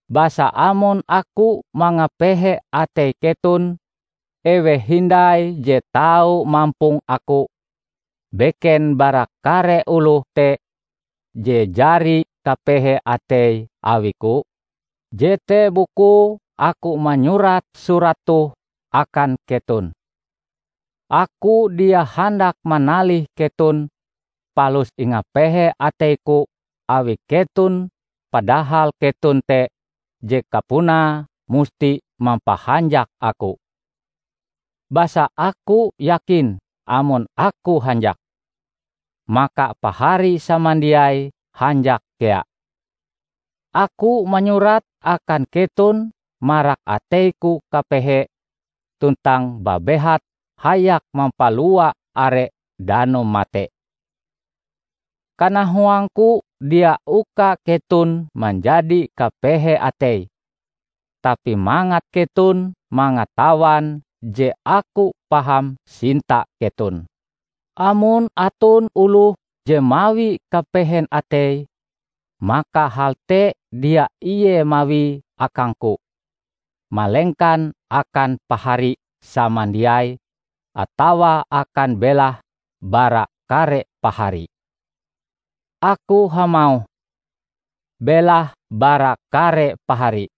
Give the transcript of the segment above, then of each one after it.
Basa amon aku mangapehe atei keton, eweh hindai je tau mampong aku, beken bara kare oloh te je jari kapehe ateie awiku? Jete bukue aku manyurat surat toh akan keton. Aku dia handak manalih keton, palus ingapehe ateiku awi keton padahal keton te je kapunae musti mampahanjak aku. Basa aku yakin amon aku hanjak, maka pahari samandiai hanjak kea. Aku manyurat akan keton marak ateiku kapehe tuntang babehat hayak mampalua are danum mate. Kanahuangku dia uka keton manjadi kapehe atei, tapi mangat keton mangatawan je aku paham sinta keton. Amon aton oloh je mawi kapehen atei, maka hal te dia ie mawie akangku, malengkan akan Pahari samandiai atawa akan belahe bara kare pahari. Aku hamauh, "belahe bara kare pahari"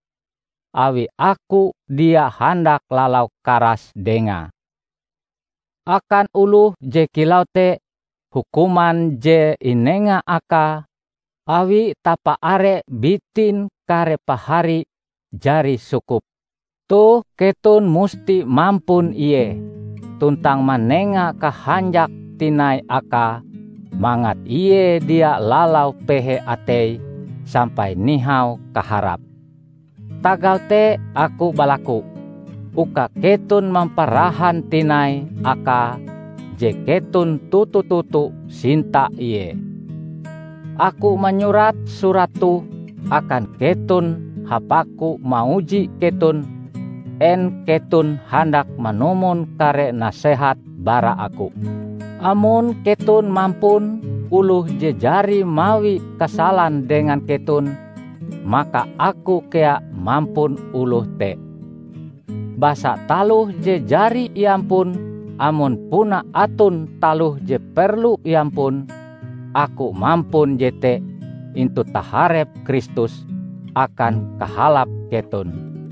awi aku dia handak lalau karas dengae. Akan oloh je kilau te, hukuman je inenga akae awi tapaare bitin kare pahari, jari sukup. Toh keton musti mampun ie tuntang manenga kahanjak tinai akae mangat ie dia lalau pehe ateie sampai nihau kaharap. Tagal te aku balaku, uka keton mamparahan tinai akae je keton toto-toto sinta ie. Aku manyurat surat toh akan keton hapaku mauji keton en keton handak manumon kare nasehat bara aku. Amon keton mampun oloh je jari mawi kasalan dengan keton maka aku kea mampun oloh te. Basa taloh je jari iampun -- amon puna aton taloh je perlu iampun -- aku mampun jete intu taharep Kristus akan kahalap keton.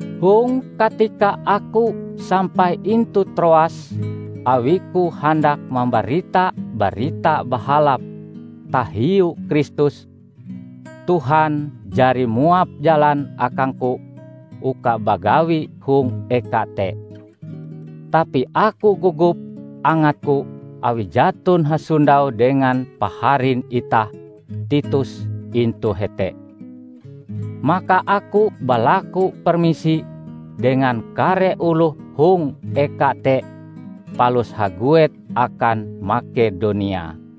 Hong katika aku sampai intu Troas awiku handak mambarita Barita Bahalap tahiu Kristus, Tuhan jari muap jalan akangku uka bagawi hong eka te. Tapi aku gogop angatku awi jaton hasondau dengan paharin itah Titus intu hete. Maka aku balaku permisi dengan kare oloh hong eka te palus haguet akan Makedonia.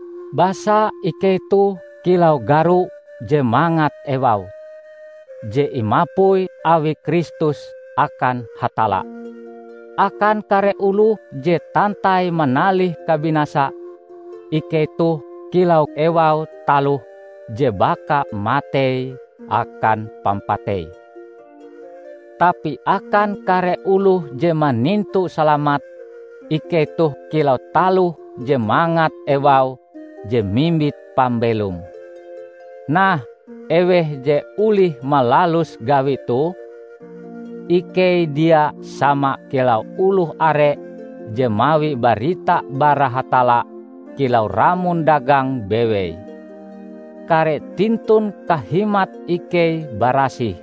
Basa ikei toh kilau garo je mangat ewaue, je imapui awi Kristus akan Hatalla. Akan kare oloh je tantai manalih kabinasa, ikei toh kilau ewau taloh je baka matei akan pampatei; tapi akan kare oloh je manintu salamat, ikei toh kilau taloh je mangat ewaue je mimbit pambelom. Nah, eweh je olih malalus gawi toh? Ikei dia sama kilau oloh are je mawi barita bara Hatalla kilau ramon dagang bewei. Kare tintun kahimat ikei barasih,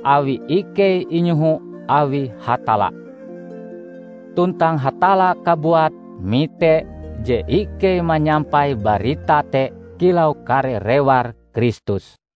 awi ikei inyoho awi Hatalla. Tuntang Hatalla kabuat mite je ikei manyampai barita te kilau kare rewar Kristus.